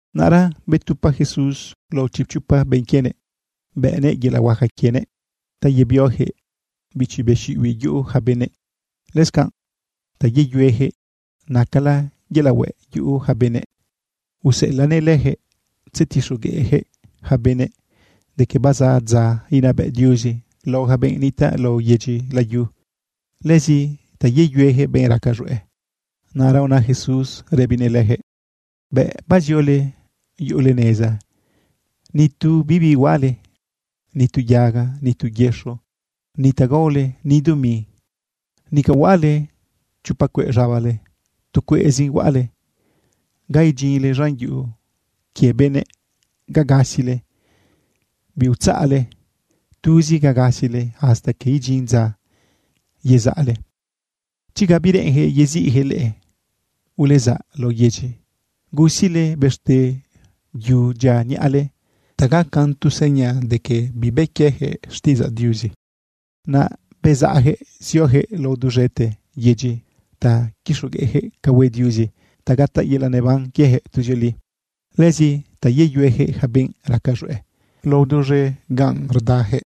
Naꞌra betupa Jesús lao chipchopa benꞌ quienëꞌ bëꞌnëꞌ yelaꞌ huaca quienëꞌ ta yebioyaquëꞌ bichi be xiꞌibiꞌ yuꞌu yaca benëꞌ, lëscanꞌ ta yeyueyaquëꞌ nacala yelaꞌ hueꞌ yuꞌu yaca benëꞌ. Useꞌelaꞌnëꞌ leyaquëꞌ tzetixogueꞌyaquëꞌ yaca benëꞌ de que bazaꞌ dza inabëꞌ Diuzi lao yaca benꞌ nitaꞌ lao yedyi layu, lëzi ta yeyueyaquëꞌ benꞌ raca z̃hueꞌ. Naꞌra una Jesús rëbinëꞌ leyaquëꞌ: ―Bëꞌ baziole yuꞌule neza, ni tu bibi huaꞌale, ni tu yaga, ni tu yëxo, ni ta gaole, ni dumi. Nica huaꞌale chopa cueꞌ z̃abale, tu cueꞌzin huaꞌale. Ga idyinle z̃an yuꞌu quie benëꞌ ga gasile, biutzaꞌle. Tuzi ga gasile hasta que idyin dza yezaꞌle. Chi ga bireꞌenyaquëꞌ yeziꞌyaquëꞌ leꞌe, ulezaꞌ lao yedyi, gusile bëxte yu dyia niꞌale ta gacan tu seña de que bibë quieyaquëꞌ xtiꞌidzaꞌ Diuzi. Naꞌ bezaꞌyaquëꞌ zioyaquëꞌ lao duz̃ete yedyi ta quixogueꞌyaquëꞌ ca hue Diuzi ta gataꞌ yelaꞌ neban quiejëꞌ tuzioli, lëzi ta yeyueyaquëꞌ yaca benꞌ raca z̃hueꞌ lao duz̃e ganꞌ rdayaquëꞌ.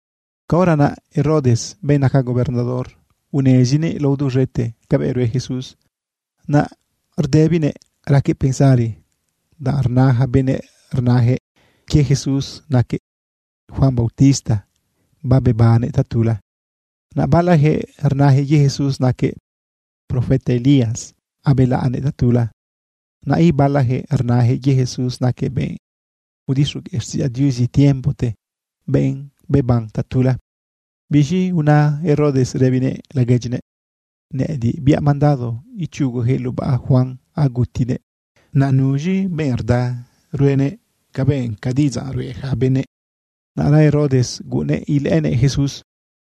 Caora naꞌ Herodes, benꞌ naca gobernador, unezinëꞌ lao duz̃ete cabëꞌ rue Jesús. Naꞌ rdëbinëꞌ raquëꞌ pensari, danꞌ rna yaca benëꞌ rnayaquëꞌ quie Jesús naquëꞌ Juan bautista babebannëꞌ tatula. Naꞌ balayaquëꞌ rnayaquëꞌ quie Jesús naquëꞌ profeta Elías abelaꞌnëꞌ tatula. Naꞌ ibalayaquëꞌ rnayaquëꞌ quie Jesús naquëꞌ benꞌ udixogueꞌ xtiꞌidzaꞌ Diuzi tiempote, benꞌ beban tatula. Biz̃i una Herodes rëbinëꞌ laguedyinëꞌ: ―Nëꞌëdiꞌ biaꞌ mandado ichuguyaquëꞌ lubaꞌ Juan agutinëꞌ. ¿Naꞌ nuz̃i benꞌ rda ruenëꞌ cabëꞌ ca diꞌidzaꞌ ruꞌe yaca benëꞌ? Naꞌra Herodes guꞌunnëꞌ ilëꞌënëꞌ Jesús.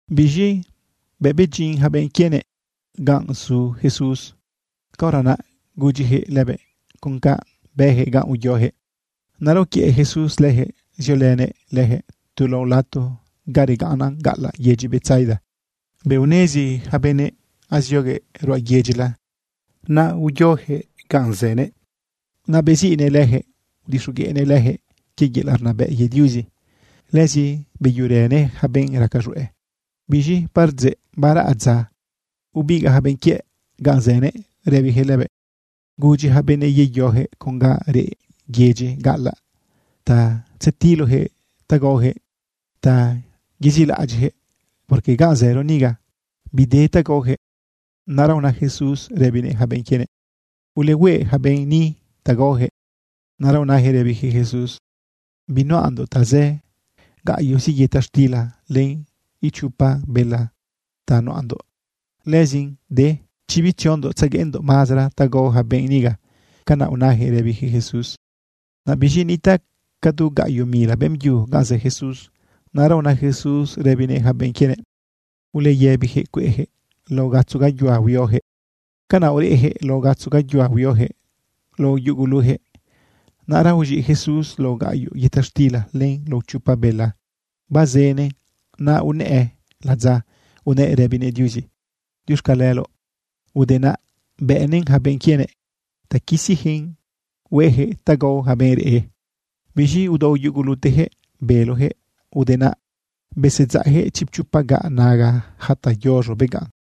Biz̃i bëꞌ bedyin yaca benꞌ quienëꞌ ganꞌ zu Jesús, caora naꞌ gudyiyaquëꞌ lëbëꞌ con canꞌ bëyaquëꞌ ganꞌ uyoyaquëꞌ. Naꞌra uquiëꞌ Jesús leyaquëꞌ ziolënëꞌ leyaquëꞌ tu lao lato ga regaꞌnnan gaꞌalaꞌ yedyi Betsaida. Bëꞌ unezi yaca benëꞌ azioguëꞌ ruꞌa yedyila, naꞌ zioyaquëꞌ ganꞌ zënëꞌ. Naꞌ beziꞌnëꞌ leyaquëꞌ udixogueꞌnëꞌ leyaquëꞌ quie yelaꞌ rnabëꞌ quie Diuzi. Lëzi beyuerënëꞌ yaca benꞌ raca z̃hueꞌ. Biz̃i bardzeꞌ baraꞌ dza, ubigaꞌ yaca benꞌ quiëꞌ ganꞌ zënëꞌ rëbiyaquëꞌ lëbëꞌ: ―Gudyi yaca benëꞌ yeyoyaquëꞌ con ga reꞌ yedyi gaꞌalaꞌ ta tzetiloyaquëꞌ ta gaoyaquëꞌ ta yezilaꞌadyiꞌyaquëꞌ, porque ganꞌ zëro niga, bide ta gaoyaquëꞌ. Naꞌra una Jesús rëbinëꞌ yaca benꞌ quienëꞌ: ―Ulehueꞌ yaca benëꞌ ni ta gaoyaquëꞌ. Naꞌra unayaquëꞌ rëbiyaquëꞌ Jesús: ―Binuꞌandoꞌ tazë. Gaꞌyoꞌzi yëta xtila len ichopa bela ta nuꞌandoꞌ. Lëzin de chi bitziondoꞌ tzegueꞌndoꞌ mazara ta gao yaca benꞌ niga. ―Canaꞌ unayaquëꞌ rëbiyaquëꞌ Jesús. Naꞌ biz̃i nitaꞌ ca du gaꞌyoꞌ mila beꞌmbyu ganꞌ zë Jesús. Naꞌra una Jesús rëbinëꞌ yaca benꞌ quienëꞌ: ―Uleyëbiyaquëꞌ cueꞌyaquëꞌ lao gatzo gayuhua huioyaquëꞌ. Canaꞌ ureꞌyaquëꞌ lao gatzo gayuhua huioyaquëꞌ lao yuguluyaquëꞌ. Naꞌra uz̃iꞌ Jesús lao gaꞌyoꞌ yëta xtila len lao chopa bela bazënëꞌn. Naꞌ unëꞌë ladza unëꞌ rëbinëꞌ Diuzi “Diuxcaleloꞌ.” Ude naꞌ, bëꞌnëꞌn yaca benꞌ quienëꞌ ta quisiyaquëꞌn hueꞌyaquëꞌ ta gao yaca benꞌ reꞌ. Biz̃i udao yuguluteyaquëꞌ beloyaquëꞌ. Ude naꞌ besedzaꞌyaquëꞌ chipchopa gaꞌ naga yaca ta yoz̃o beganꞌ.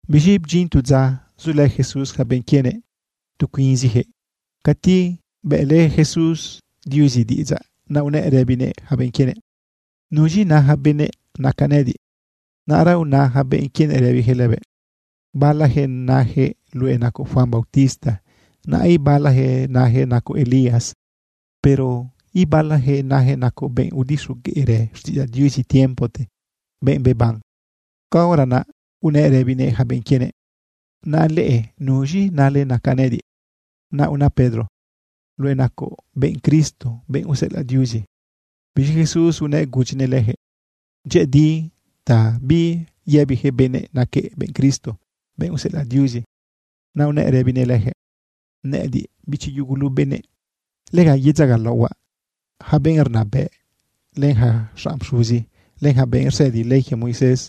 Biz̃i bdyin tu dza zulë Jesús yaca benꞌ quienëꞌ tu cuinziyaquëꞌ cati bëꞌlë Jesús Diuzi diꞌidzaꞌ. Naꞌ unëꞌ rëbinëꞌ yaca benꞌ quienëꞌ: ―¿Nuz̃i na yaca benëꞌ nacaꞌ nëꞌëdiꞌ? Naꞌra una yaca benꞌ quienëꞌ rëbiyaquëꞌ lëbëꞌ: ―Balayaquëꞌ nayaquëꞌ luëꞌ nacoꞌ Juan bautista, naꞌ ibalayaquëꞌ nayaquëꞌ nacoꞌ Elías. Pero ibalayaquëꞌ nayaquëꞌ nacoꞌ benꞌ udixogueꞌrë xtiꞌidzaꞌ Diuzi tiempote, benꞌ beban. Caora naꞌ unëꞌ rëbinëꞌ yaca benꞌ quienëꞌ: ―¿Naꞌa leꞌe, nuz̃i nale nacaꞌ nëꞌëdiꞌ? Naꞌ unë Pedro: ―Luëꞌ nacoꞌ benꞌ Cristo, benꞌ useꞌelaꞌ Diuzi. Biz̃i Jesús unëꞌ gudyinëꞌ leyaquëꞌ dyëꞌëdi ta biyëbiyaquëꞌ benëꞌ naquëꞌ benꞌ Cristo, benꞌ useꞌelaꞌ Diuzi. Naꞌ unëꞌ rëbinëꞌ leyaquëꞌ: ―Nëꞌëdiꞌ, bichi yugulu benëꞌ, lega yedzagalaohuaꞌ. Yaca benꞌ rnabëꞌ, len yaca xanꞌ pxuzi, len yaca benꞌ rsëdi ley quie Moisés,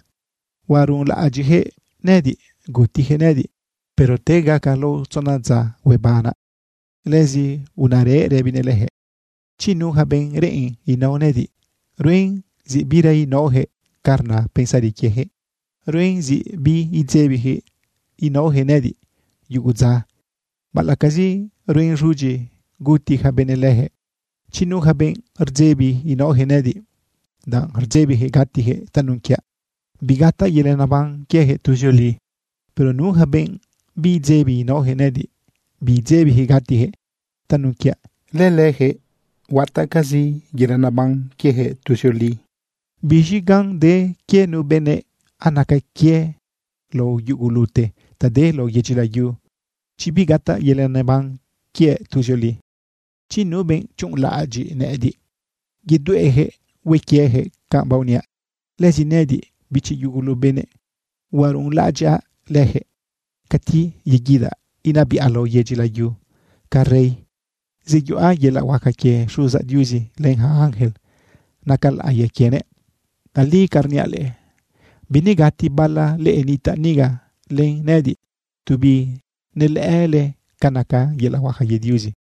huaruꞌunlaꞌadyiꞌyaquëꞌ nëꞌëdiꞌ, gutiyaquëꞌ nëꞌëdiꞌ. Pero te gaca lao tzona dza, huebanaꞌ. Lëzi unarëꞌ rëbinëꞌ leyaquëꞌ: ―Chi nu yaca benꞌ reꞌen inao nëꞌëdiꞌ, ruen zi bira inaoyaquëꞌ ca rna pensari quieyaquëꞌ. Ruen zi biidzebiyaquëꞌ naoyaquëꞌ nëꞌëdiꞌ yugu dza, baꞌalaꞌcazi ruen z̃udyi guti ja benëꞌ leyaquëꞌ. Chi nu yaca benꞌ rdzebi inaoyaquëꞌ nëꞌëdiꞌ, danꞌ rdzebiyaquëꞌ gatiyaquëꞌ tanun quiaꞌ, bigataꞌ yelaꞌ neban quiejëꞌ tuzioli. Pero nu yaca benꞌ bibdzebi inaoyaquëꞌ nëꞌëdiꞌ, bibdzebiyaquëꞌ gatiyaquëꞌ tanun quiaꞌ, lëlëyaquëꞌ huataꞌcazi yelaꞌ neban quieyaquëꞌ tuzioli. ¿Biz̃i gan de quie nu benëꞌ anaca quiëꞌ lao yugulute ta de lao yedyi layu, chi bigataꞌ yelaꞌ neban quiëꞌ tuzioli? Chi nu benꞌ chuꞌunlaꞌadyiꞌ nëꞌëdiꞌ yedueꞌyaquëꞌ hue quieyaquëꞌ canꞌ baoniaꞌ, lëzi nëꞌëdiꞌ, bichi yugulu benëꞌ, huaruꞌunlaꞌadyaꞌ leyaquëꞌ cati yeguidaꞌ inabiꞌa lao yedyi layu ca rey. Zeyuꞌa yelaꞌ huaca quie Xuzaꞌ Diuzi len yaca ángel naca laꞌiya quienëꞌ. Tali ca rniaꞌ leꞌe, binegati bala leꞌe nitaꞌ niga len nëꞌëdiꞌ tu binelëꞌële ca naca yelaꞌ huaca quie Diuzi.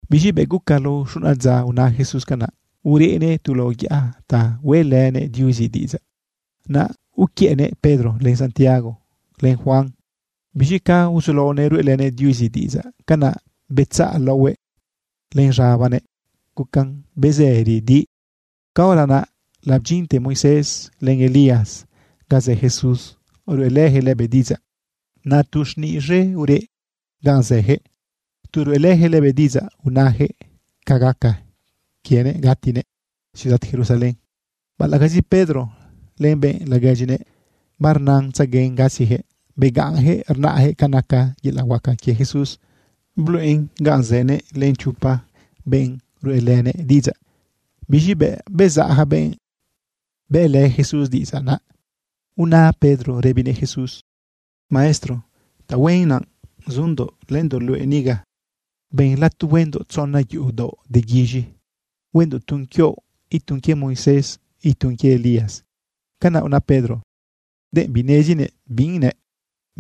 Biz̃i bëꞌ guca lao xuna dza una Jesús canaꞌ, urënëꞌ tu lao yaꞌa ta hueꞌlënëꞌ Diuzi diꞌidzaꞌ. Naꞌ uquiëꞌnëꞌ Pedro, len Santiago, len Juan. Biz̃i ca uzulaonëꞌ ruꞌelënëꞌ Diuzi diꞌidzaꞌ, canaꞌ betzaꞌ laohuëꞌ len z̃abanëꞌ gucan bezëri di. Caora naꞌ labdyinte Moisés len Elías ga zë Jesús, ruꞌelëyaquëꞌ lëbëꞌ diꞌidzaꞌ. Naꞌ tu xniꞌ z̃e ureꞌ ganꞌ zëyaquëꞌ tu ruꞌelëyaquëꞌ lëbëꞌ diꞌidzaꞌ unayaquëꞌ ca gaca quienëꞌ gatinëꞌ ciudad Jerusalén. Baꞌalaꞌcazi Pedro len benꞌ laguedyinëꞌ barnatzeguen gasiyaquëꞌ, begaꞌnyaquëꞌ rnaꞌyaquëꞌ ca naca yelaꞌ huaca quie Jesús bluꞌen ga zënëꞌ len chopa benꞌ ruꞌelënëꞌ diꞌidzaꞌ. Biz̃i bëꞌ bezaꞌ yaca benꞌ bëꞌlë Jesús diꞌidzaꞌ, naꞌ una Pedro rëbinëꞌ Jesús: ―Maestro, tahuen naꞌ zundoꞌ lëndoꞌ luëꞌ niga. Ben lato huendoꞌ tzona yuꞌu daoꞌ de guiz̃i. Huendoꞌ tun quioꞌ, itun quie Moisés, itun quie Elías. ―Canaꞌ una Pedro denꞌ binezinëꞌ bi nëꞌ.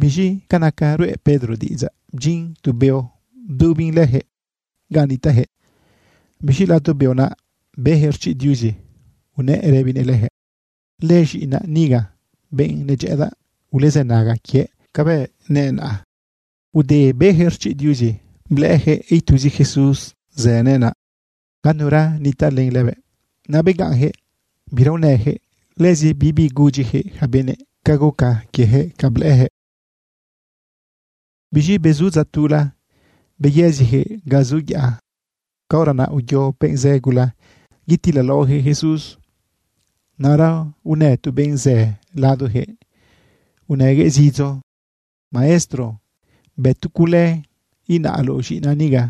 Biz̃i ca naca ruꞌe Pedro diꞌidzaꞌ, bdyin tu beo bdubin leyaquëꞌ ganꞌ nitaꞌyaquëꞌ. Biz̃i lado beo naꞌ beyaquëꞌ rchiꞌ Diuzi unëꞌ rëbinëꞌ leyaquëꞌ. ―Lëz̃iꞌinaꞌ niga, benꞌ nedyëꞌëdaꞌ. Ulezënaga quiëꞌ cabëꞌ nëꞌ naꞌ. Ude beyaquëꞌ rchiꞌ Diuzi, blëꞌëyaquëꞌ ituzi Jesús zënëꞌ naꞌ. Ganura nitaꞌ len lëbëꞌ. Naꞌ begaꞌnyaquëꞌ bira unëyaquëꞌ. Lëzi bibi gudyiyaquëꞌ yaca benëꞌ ca guca quieyaquëꞌ ca blëꞌëyaquëꞌ. Biz̃i bezu dza tula, beyëziyaquëꞌ ga zu yaꞌa. Caora naꞌ uyo benꞌ zë gula yetilalaoyaquëꞌ Jesús. Naꞌra unë tu benꞌ zë ladoyaquëꞌ unëguëꞌ zidzo: ―Maestro, bë tu cule, inaꞌloꞌ z̃iꞌinaꞌ niga.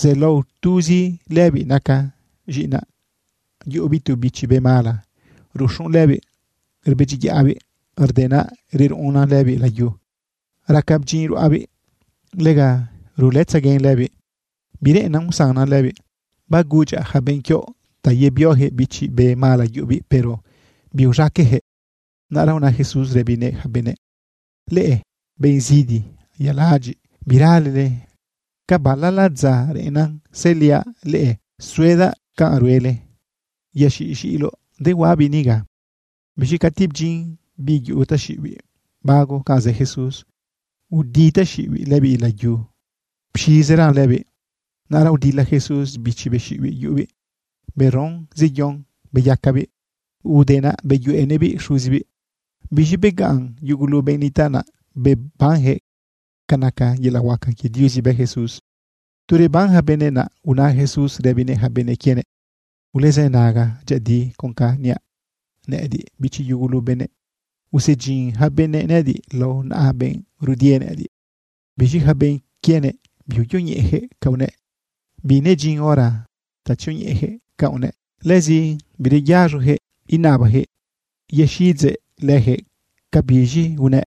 Zelao tuzi lëbiꞌ naca z̃iꞌinaꞌ. Yuꞌubiꞌ tu bichi be mala ruxun lëbiꞌ rbedyiyaꞌbiꞌ. Rde naꞌ reruꞌunnan lëbiꞌ layu, raca bdyinꞌ ruꞌabiꞌ. Lega rulëtzaguen lëbiꞌ, bireꞌennan usannan lëbiꞌ. Bagudyaꞌ yaca benꞌ quioꞌ ta yebioyaquëꞌ bichi be mala yuꞌubiꞌ, pero biuz̃aqueꞌyaquëꞌ. Naꞌra una Jesús rëbinëꞌ yaca benëꞌ: ―¡Leꞌe, benꞌ zidi yaladyiꞌ, biralele! ¿Ca balala dza reꞌennan sëliaꞌ leꞌe suedaꞌ canꞌ ruele? Yaxiꞌ z̃iꞌiloꞌ dehuaꞌabiꞌ niga. Biz̃i cati bdyin biꞌ yuꞌu taxiꞌibiꞌ bago ganꞌ zë Jesús, udi taxiꞌibiꞌ lëbiꞌ layu, pxizeran lëbiꞌ. Naꞌra udila Jesús bichi be xiꞌibiꞌ yuꞌubiꞌ beron zeyon beyacabiꞌ. Ude naꞌ beyuꞌenëꞌbiꞌ xuzibiꞌ. Biz̃i begaꞌn yugulu benꞌ nitaꞌ naꞌ bebanyaquëꞌ ca naca yelaꞌ huaca quie Diuzi bë Jesús. Tu reban yaca benëꞌ, naꞌ una Jesús rëbinëꞌ yaca benꞌ quienëꞌ: ―Ulezënaga dyëꞌëdi con canꞌ niaꞌ. Nëꞌëdiꞌ, bichi yugulu benëꞌ, usedyin yaca benëꞌ nëꞌëdiꞌ lao naꞌa benꞌ rudie nëꞌëdiꞌ. Biz̃i yaca benꞌ quienëꞌ biuyoñeꞌeyaquëꞌ ca unëꞌ. Binedyin hora ta tzioñeꞌeyaquëꞌ canꞌ unëꞌ. Lëzi bireyaz̃oyaquëꞌ inabayaquëꞌ yexiꞌidzëꞌ leyaquëꞌ cabiz̃i unëꞌ.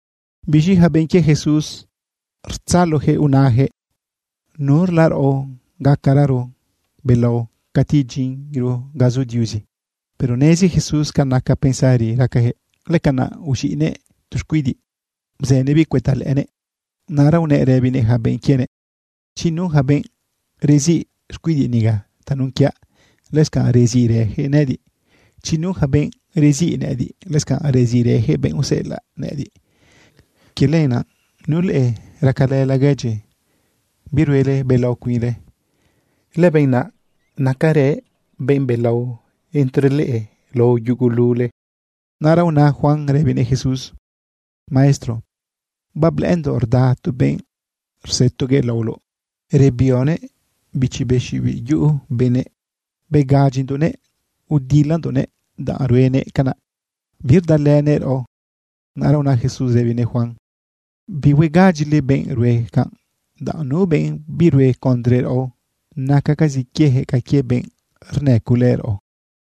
Biz̃i yaca benꞌ quie Jesús rtzaloyaquëꞌ unayaquëꞌ: ―¿Nurla raꞌo gacararo belao cati idyinro ga zu Diuzi? Pero nezi Jesús ca naca pensari racayaquëꞌ. Lëcanaꞌ uz̃iꞌnëꞌ tu xcuidiꞌ bzënëꞌbiꞌ cuëta lëꞌënëꞌ. Naꞌra unëꞌ rëbinëꞌ yaca benꞌ quienëꞌ: ―Chi nu yaca benꞌ reziꞌ xcuidiꞌ niga tanun quiaꞌ, lëscanꞌ reziꞌrëyaquëꞌ nëꞌëdiꞌ. Chi nu yaca benꞌ reziꞌ nëꞌëdiꞌ, lëscanꞌ reziꞌrëyaquëꞌ benꞌ useꞌelaꞌ nëꞌëdiꞌ. Quie lenaꞌ, nu leꞌe racalë laguedyi, biruele belao cuinle, lëbenꞌ naꞌ nacarëꞌ benꞌ belao entre leꞌe lao yugulule. Naꞌra una Juan rëbinëꞌ Jesús: ―Maestro, bablëꞌëndoꞌ rda tu benꞌ rzëtoguëꞌ laoloꞌ rebioguëꞌ bichi be xiꞌibiꞌ yuꞌu benëꞌ. Begadyindoꞌnëꞌ udilalëndoꞌnëꞌ, danꞌ ruenëꞌ canaꞌ birdalënëꞌ raꞌo. Naꞌra una Jesús rëbinëꞌ Juan: ―Bihuegadyile benꞌ rue canꞌ, danꞌ nu benꞌ birue condre raꞌo, nacacazi quieyaquëꞌ ca quie benꞌ rnëculë raꞌo.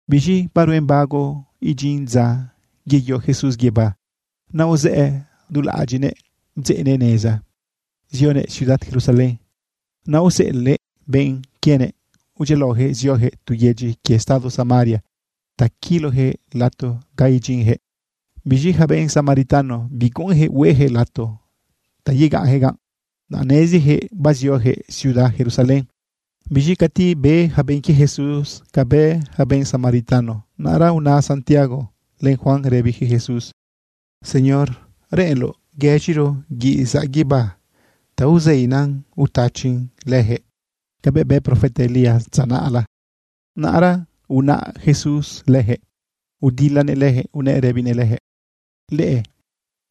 Biz̃i baruen bago idyin dza yeyo Jesús guibá, naꞌ uzëꞌë du laꞌadyiꞌnëꞌ bdzeꞌnëꞌ neza zionëꞌ ciudad Jerusalén. Naꞌ aoseꞌelëꞌ benꞌ quienëꞌ udyialaoyaquëꞌ zioyaquëꞌ tu yedyi quie estado Samaria ta quiloyaquëꞌ lato ga idyinyaquëꞌ. Biz̃i yaca benꞌ Samaritano, biguꞌunyaquëꞌ hueyaquëꞌ lato ta yegaꞌnyaquëꞌ ganꞌ, danꞌ neziyaquëꞌ bazioyaquëꞌ ciudad Jerusalén. Biz̃i cati be yaca benꞌ quie Jesús cabëꞌ bë yaca benꞌ Samaritano, naꞌra una Santiago len Juan rëbiyaquëꞌ Jesús: ―Señor, ¿reꞌenloꞌ guëz̃iro guiꞌ zaꞌ guibá ta uzeina utachin leyaquëꞌ cabëꞌ bë profeta Elías dza naꞌla? Naꞌra unaꞌ Jesús leyaquëꞌ udilanëꞌ leyaquëꞌ unëꞌ rëbinëꞌ leyaquëꞌ: ―Leꞌe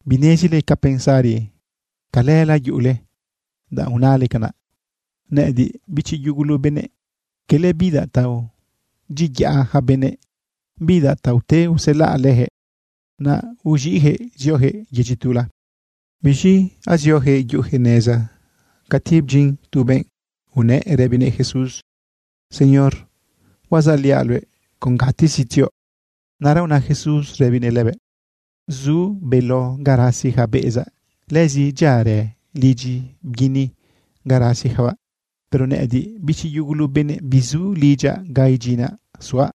binezile ca pensari calëla yuꞌule, danꞌ unale canaꞌ. Nëꞌëdiꞌ, bichi yugulu benëꞌ, cala bidaꞌ ta aodyiayaꞌ yaca benëꞌ, bidaꞌ ta ute uselaꞌ leyaquëꞌ. Naꞌ uz̃iꞌyaquëꞌ zioyaquëꞌ yedyi tula. Biz̃i azioyaquëꞌ yuꞌuyaquëꞌ neza cati bdyin tu benꞌ unëꞌ rëbinëꞌ Jesús: ―¿Señor, huazaꞌliaꞌ luëꞌ con gatezi tzioꞌ? Naꞌra una Jesús rëbinëꞌ lëbëꞌ: ―Zu beló ga rasi yaca beꞌezaꞌ. Lëzi dyiarë lidyi bguini ga rasiyacabaꞌ. Pero nëꞌëdiꞌ, bichi yugulu benëꞌ, bizu lidyaꞌ ga idyinaꞌ suaꞌ.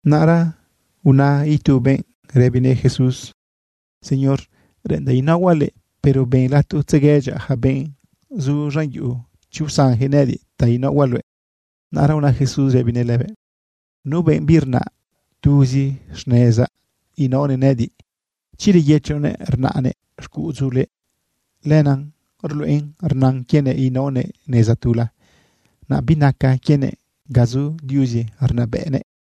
Naꞌra una itu benꞌ rëbinëꞌ Jesús: ―Señor, reꞌendaꞌ inaohuaꞌ luëꞌ, pero ben lato tzeguedyaꞌ yaca benꞌ zu z̃an yuꞌu, chi usanyaquëꞌ nëꞌëdiꞌ ta inaohuaꞌ luëꞌ. Naꞌra una Jesús rëbinëꞌ lëbëꞌ: ―Nu benꞌ birnaꞌ tuzi xnezaꞌ inaonëꞌ nëꞌëdiꞌ, chi reyëchonëꞌ rnaꞌnëꞌ xcuꞌudzule, lenaꞌ ruluꞌen rnan quienëꞌ inaonëꞌ neza tula. Naꞌ binaca quienëꞌ ga zu Diuzi rnabëꞌnëꞌ.